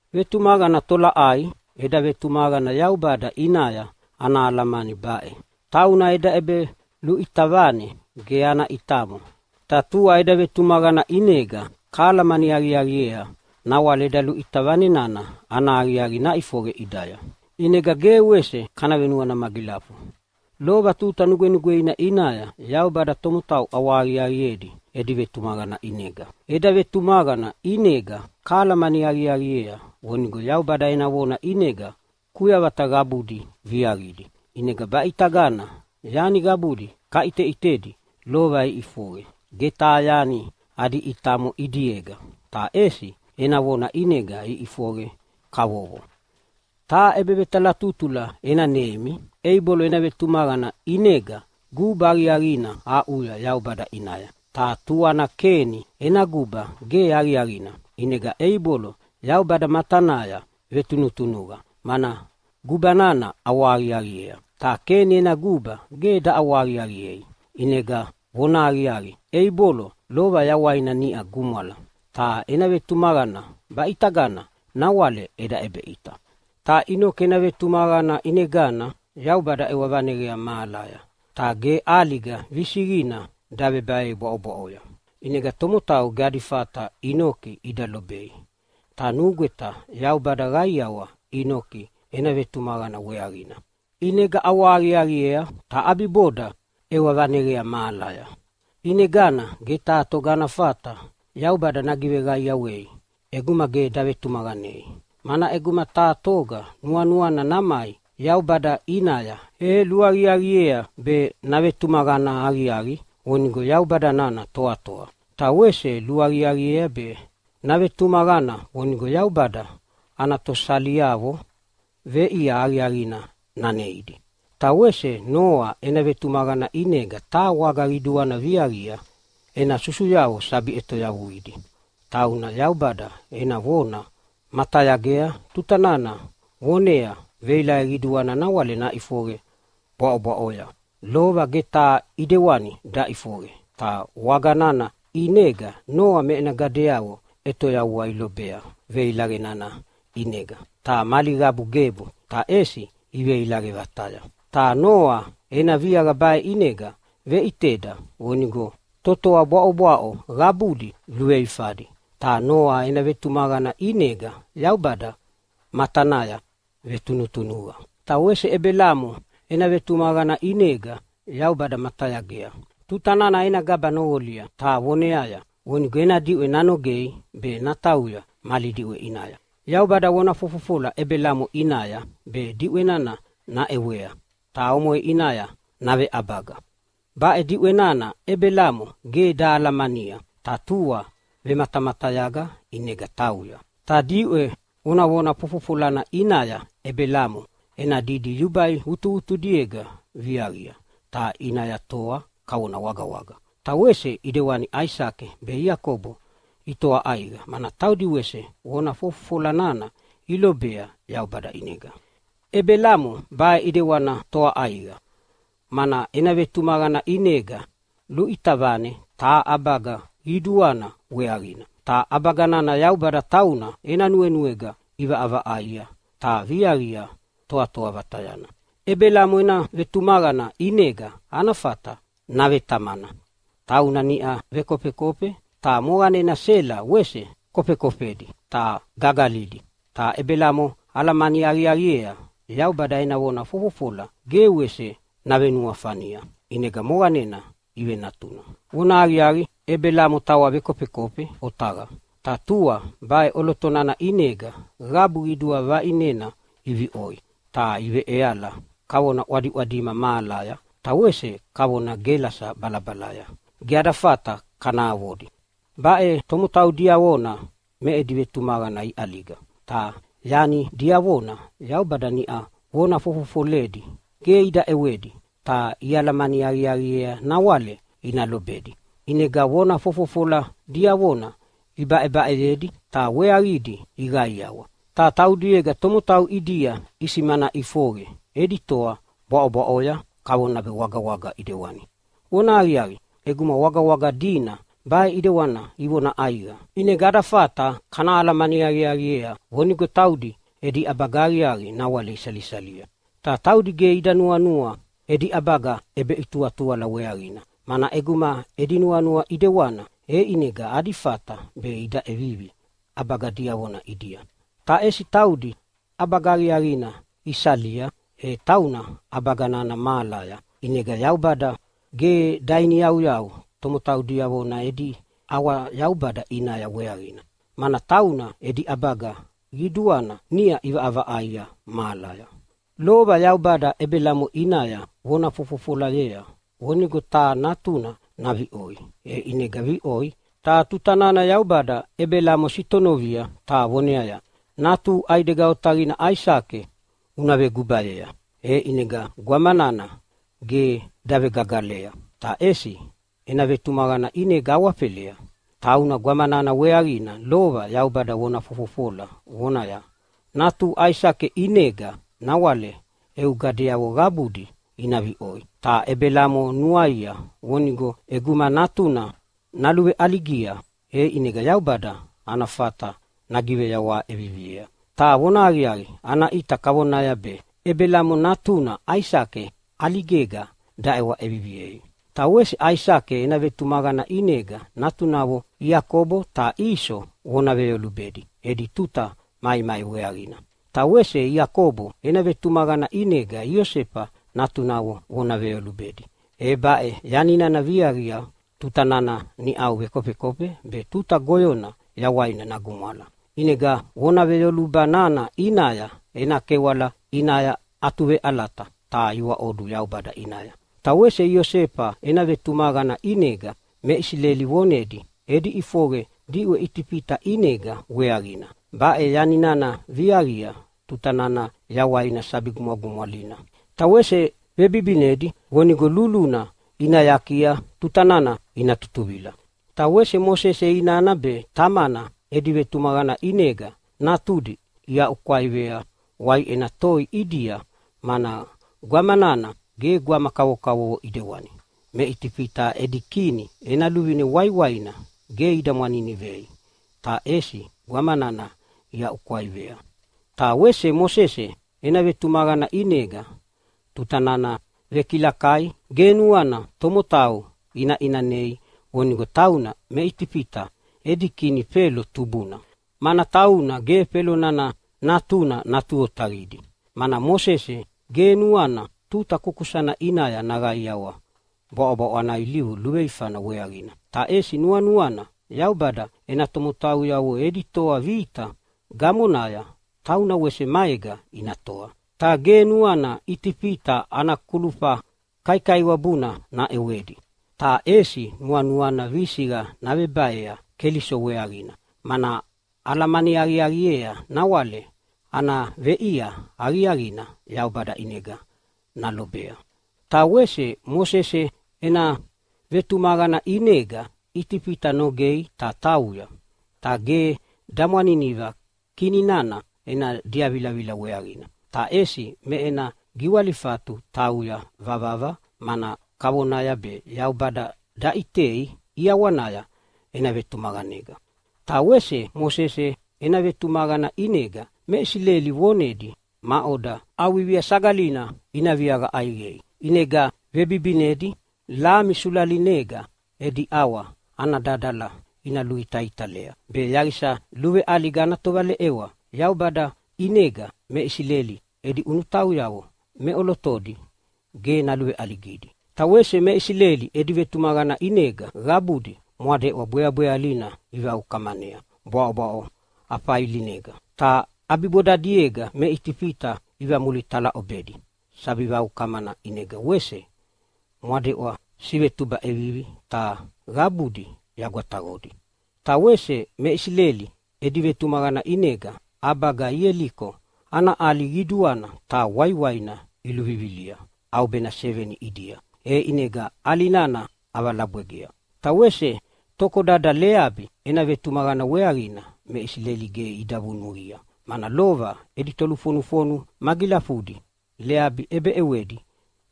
Vetumaqana tolaʼai? Eda vetumaqana Yaubada ʼinaya ana alamani baʼe: Tauna eda ʼebeluʼita vane ge ana ʼitamo, ta tua eda vetumaqana ʼinega kahalamani aqiaqiea nawale eda luʼita vane nana ana aqiaqi naʼifoqe ʼidaya, ʼinega ge wese kana venuana magilafu. Lova tuta nugwenugweina ʼinaya Yaubada tomotau ʼawahaqiaqiedi edi vetumaqana ʼinega. Eda vetumaqana ʼinega kahalamani aqiaqiea vonigo Yaubada ena vona ʼinega kuyavata qabudi viaqidi, ʼinega baʼitagana yani qabudi kaʼiteʼitedi lova iʼifoqe ge taha yani adi ʼitamo ʼidiega, ta ʼesi ena vona ʼinega iʼifoqe kavovo. Taha ʼebevetalatutula ena neimi: Eibolo ena vetumaqana ʼinega guba aqiaqina aʼuya Yaubada ʼinaya, ta tuana Keni ena guba ge aqiaqina. ʼInega Eibolo Yaubada matanaya vetunutunuqa, mana guba nana ʼawahaqiaqiea, ta Keni ena guba ge daʼawahaqiaqiei. ʼInega vonahaqiaqi, Eibolo lova yawaina niʼa gumwala, ta ena vetumaqana baʼitagana nawale eda ʼebeʼita. Ta Inoki ena vetumaqana ʼinegana Yaubada ʼewa vaneqea mahalaya ta ge ʼaliga visiqina davebaei bwaʼobwaʼoya, ʼinega tomotau ge adi fata Inoki ida lobei. Ta nugweta Yaubada qaiawa Inoki ena vetumaqana weaqina, ʼinega ʼawahaqiaqiea, ta ʼabiboda ʼewa vaneqea mahalaya. ʼInegana ge taha toga ana fata Yaubada nagiveqaiawei ʼeguma ge davetumaqanei, mana ʼeguma taha toga nuanuana namai Yaubada ʼinaya e luaqiaqiea be navetumaqana aqiaqi vonigo Yaubada nana toatoa. Ta wese luaqiaqiea be navetumaqana vonigo Yaubada ana tosaliavo veʼia aqiaqina naneidi. Ta wese Noa ena vetumaqana ʼinega taha waga qiduana viaqia ena susuyavo sabi ʼetoyavuidi. Tauna Yaubada ena vona matayagea tuta nana vonea veilaqe qiduana nawale naʼifoqe bwaʼobwaʼoya, lova ge taha ʼidewani daʼifoqe. Ta waga nana ʼinega Noa me ena gadeavo ʼetoyavua ilobea veilaqe nana ʼinega, ta mali qabu gebu, ta ʼesi iveilaqe vataya. Ta Noa ena viaqa baʼe ʼinega veʼiteda vonigo totoa bwaʼobwaʼo qabudi luveifadi, ta Noa ena vetumaqana ʼinega Yaubada matanaya vetunutunuqa. Ta wese Ebelamo ena vetumaqana ʼinega Yaubada matayagea tuta nana ena gaba noqolia ta voneaya vonigo ena diʼwe nanogei be natauya mali diʼwe ʼinaya. Yaubada vona fofofola Ebelamo ʼinaya be diʼwe nana naʼewea ta omoʼe ʼinaya naveʼabaga. Baʼe diʼwe nana Ebelamo ge dahalamania ta tua vematamatayaga ʼinega tauya. Ta diʼwe vonavona fofofolana ʼinaya Ebelamo ena didi yubai vutuvutudiega viaqia ta ʼinaya toa kavona wagawaga. Ta wese ʼidewani Aisake be Iakobo itoa ʼaiqa, mana taudi wese vona fofofola nana ilobea Yaubada ʼinega. Ebelamo baʼe ʼidewani toa ʼaiqa, mana ena vetumaqana ʼinega luʼita vane taha ʼabaga qiduana weaqina. Ta ʼabaga nana Yaubada tauna ena nuenuega ʼivaʼavaʼaia ta viaqia toatoa vatayana. Ebelamo ena vetumaqana ʼinega ana fata navetamana. Tauna niʼa vekofekofe, ta moqanena Sela wese kofekofedi ta gagalidi. Ta Ebelamo alamani aqiaqiea Yaubada ena vona fofofola ge wese navenuafania, ʼinega moqanena ivenatuna. Vonahaqiaqi, Ebelamo tawa vekofekofe otaqa, ta tua baʼe ʼoloto nana ʼinega qabu qidua vaʼinena iviʼoi ta iveʼeala kavona ʼwadiʼwadima mahalaya ta wese kavona gelasa balabalaya, ge ada fata kana avodi. Baʼe tomotau diavona me edi vetumaqana iʼaliga. Ta yani diavona Yaubada niʼau vona fofofoledi ge ida ʼewedi, ta ialamani aqiaqiea nawale ina lobedi, ʼinega vona fofofola diavona ibaʼebaʼeyedi, ta weaqidi iqaiawa. Ta taudiega tomotau ʼidia isimana ʼifoqe edi toa bwaʼobwaʼoya kavona be wagawaga ʼidewani. Vonahaqiaqi, ʼeguma wagawaga dina baʼe ʼidewana ivona ʼaiqa ʼinega ada fata kana alamani aqiaqiea vonigo taudi edi ʼabaga aqiaqi nawale isalisalia. Ta taudi ge ida nuanua edi ʼabaga ʼebeʼituʼituala weaqina, mana ʼeguma edi nuanua ʼidewana e ʼinega adi fata be ida ʼevivi ʼabaga diavona ʼidia, ta ʼesi taudi ʼabaga aqiaqina isalia, e tauna ʼabaga nana mahalaya. ʼInegana Yaubada ge dainiyauyau tomotau diavona edi ʼawa-Yaubada ʼinaya weaqina, mana tauna edi ʼabaga qiduana niʼau ʼivaʼavaʼaia mahalaya. Lova Yaubada Ebelamo ʼinaya vona fofofolayea vonigo taha natuna naviʼoi, e ʼinega viʼoi. Ta tuta nana Yaubada Ebelamo sitonovia ta voneaya, “Natuhu ʼaidega otaqina Aisake una vegubayea.” E ʼinega gwama nana ge davegagalea, ta ʼesi ena vetumaqana ʼinega awafelea. Tauna gwama nana weaqina lova Yaubada vona fofofola vonaya, “Natuhu Aisake ʼinega nawale eu gadeavo qabudi ina viʼoi.” Ta Ebelamo nuaia vonigo ʼeguma natuna naluveʼaligia e ʼinega Yaubada ana fata nagiveyawaha ʼeviviea. Ta vonahaqiaqi, ana ʼita kavona be Ebelamo natuna Aisake ʼaligega daʼewa ʼeviviei. Ta wese Aisake ena vetumaqana ʼinega natunavo Iakobo ta Iso vona veyolubedi edi tuta maimai weaqina. Ta wese Iakobo ena vetumaqana ʼinega Iosefa natunavo vona veyolubedi. E baʼe yani nana viaqia tuta nana niʼau vekofekofe be tuta goyona yawaina nagumwala. ʼInega vona veyoluba nana ʼinaya ena kewala ʼinaya atuveʼalata ta iwaʼodu Yaubada ʼinaya. Ta wese Iosefa ena vetumaqana ʼinega me Isileli vonedi edi ʼifoqe diʼwe Itifita ʼinega weaqina. Baʼe yani nana viaqia tuta nana yawaina sabi gumwagumwalina. Ta wese vebibinedi vonigo luluna ina yakia tuta nana ina tutuvila. Ta wese Mosese inana be tamana edi vetumaqana ʼinega natudi iaʼukwaivea waiʼena toi ʼidia, mana gwama nana ge gwama kavokavovo ʼidewani. Me Itifita edi kini ena luvine waiwaina ge ida mwaninivei ta ʼesi gwama nana iaʼukwaivea. Ta wese Mosese ena vetumaqana ʼinega tuta nana vekilakai ge nuana tomotau ina ʼinanei vonigo tauna me Itifita edi kini Felo tubuna, mana tauna ge Felo nana natuna natu otaqidi. Mana Mosese ge nuana tuta kukusana ʼinaya naqaiawa bwaʼobwaʼo ana ilivu luveifana weaqina, ta ʼesi nuanuana Yaubada ena tomotauyavo edi toa vita gamonaya tauna wese maega ina toa. Ta ge nuana Itifita ana kulufa kaikaiwabuna naʼewedi, ta ʼesi nuanuana visiqa navebaea Keliso weaqina, mana alamani aqiaqiea nawale ana veʼia aqiaqina Yaubada ʼinega nalobea. Ta wese Mosese ena vetumaqana ʼinega Itifita nogei ta tauya. Ta ge damwaniniva kini nana ena diavilavila weaqina, ta ʼesi me ena giwalifatu tauya vavava, mana kavonaya be Yaubada daʼitei ʼiawanaya ena vetumaqanega. Ta wese Mosese ena vetumaqana ʼinega me Isileli vonedi maʼoda ʼAuvivia Sagalina ina viaqa ʼaiqei, ʼinega vebibinedi lami sulalinega edi ʼawa ana dadala ina luitaitalea, be yaqisa luveʼaliga ana tovaleʼewa Yaubada ʼinega me Isileli edi ʼunutauyavo meʼolotodi ge naluveʼaligidi. Ta wese me Isileli edi vetumaqana ʼinega qabudi Mwadeʼwa Bweabwealina ivaukamanea bwaʼobwaʼo afailinega. Ta ʼabibodadiega me Itifita ivamulitalaʼobedi sabi vaukamana, ʼinega wese mwadeʼwa sivetuba ʼevivi ta qabudi yagwataqodi. Ta wese me Isileli edi vetumaqana ʼinega ʼabaga Ieliko ana ʼali qiduana ta waiwaina iluvivilia ʼaubena seveni ʼidia, e ʼinega ʼali nana ʼavalabwegea. Ta wese tokodada Leabi ena vetumaqana weaqina me Isileli ge ida vunuqia, mana lova edi tolufonufonu magilafudi Leabi ʼebeʼewedi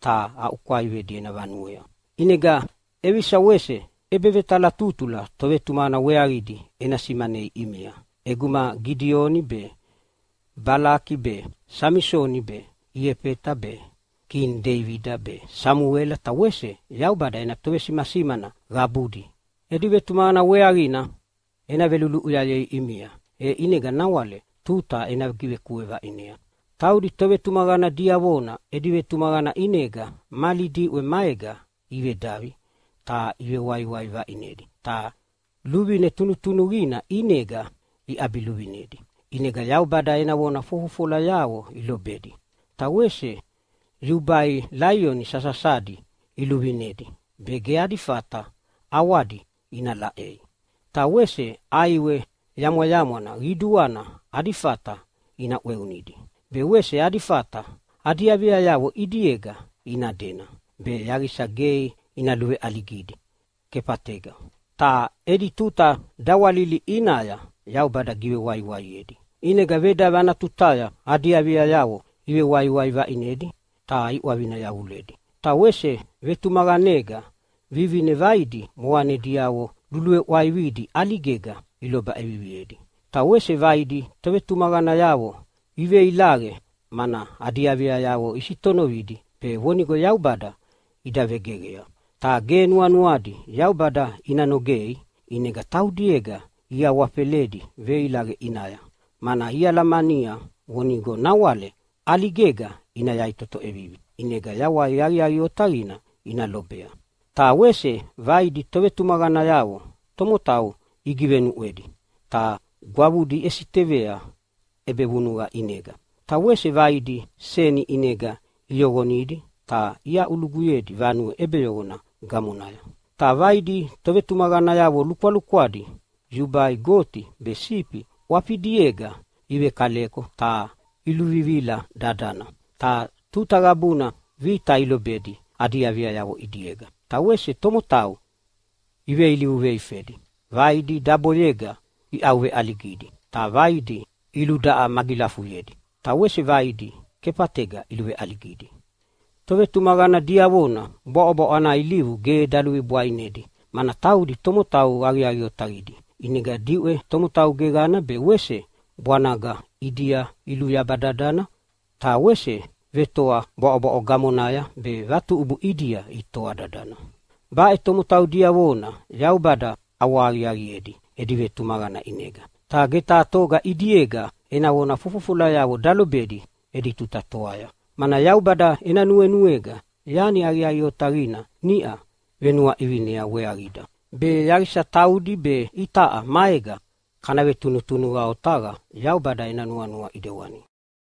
ta aʼukwaivedi ena vanuea. ʼInega ʼevisa wese ʼebevetalatutula tovetumaqana weaqidi ena simanei ʼimia? ʼEguma Gidioni be, Balaki be, Samisoni be, Iefeta be, kini Deibida be, Samuela ta wese Yaubada ena tovesimasimana qabudi edi vetumaqana weaqina ena veluluʼuyayei ʼimia, e ʼinega nawale tuta ena givekue vaʼinea. Taudi tovetumaqana diavona edi vetumaqana ʼinega mali diʼwe maega ivedavi ta ivewaiwai vaʼinedi ta luvine tunutunuqina ʼinega iʼabiluvinedi, ʼinega Yaubada ena vona fofofolayavo ilobedi. Ta wese yubai laioni sasasadi iluvinedi be ge adi fata ʼawadi ina laʼei. Ta wese ʼaiwe yamwayamwana qiduana adi fata ina ʼweunidi, be wese adi fata adi aviayavo ʼidiega ina dena be yaqisa ge ina luveʼaligidi kefatega. Ta edi tuta dawalili ʼinaya Yaubada givewaiwaiedi, ʼinega vedavi ana tutaya adi aviayavo ivewaiwai vaʼinedi ta iʼwavina yavuledi. Ta wese vetumaqanega vivine vaidi moqanediavo luluveʼwaividi ʼaligega iloba ʼeviviedi. Ta wese vaidi tovetumaqanayavo iveilaqe, mana adi aviayavo isitonovidi be vonigo Yaubada ida vegeqea. Ta ge nuanuadi Yaubada ina nogei, ʼinega taudiega iawafeledi veilaqe ʼinaya, mana ialamania vonigo nawale ʼaligega ina yaʼitoto ʼevivi ʼinega yawai aqiaqi otaqina ina lobea. Ta wese vaidi tovetumaqanayavo tomotau igivenuʼwedi ta gwavudi iʼesitevea ʼebevunuqa ʼinega. Ta wese vaidi seni ʼinega iyoqonidi ta iaʼuluguyedi vanue ʼebeyoqona gamonaya. Ta vaidi tovetumaqanayavo lukwalukwadi yubai goti be sifi ʼwafidiega ivekaleko ta iluvivila dadana. Ta tuta qabuna vita ilobedi adi aviayavo ʼidiega, ta wese tomotau iveilivu veifedi. Vaidi daboyega iʼauveʼaligidi, ta vaidi iludaʼa magilafuyedi ta wese vaidi kefatega iluveʼaligidi. Tovetumaqana diavona bwaʼobwaʼo ana ilivu ge daluvibwainedi, mana taudi tomotau aqiaqi otaqidi. ʼInega diʼwe tomotau geqana be wese bwanaga ʼidia iluyaba dadana. Ta wese vetoa bwaʼobwaʼo gamonaya be vatuʼubu ʼidia itoa dadana. Baʼe tomotau diavona Yaubada ʼawahaqiaqiedi edi vetumaqana ʼinega. Ta ge taha toga ʼidiega ena vona fofofolayavo dalobedi edi tuta toaya, mana Yaubada ena nuenuega yani aqiaqi otaqina niʼa venuaʼivinea weaqida, be yaqisa taudi be itaʼa maega kana vetunutunuqa otaqa Yaubada ena nuanua ʼidewana.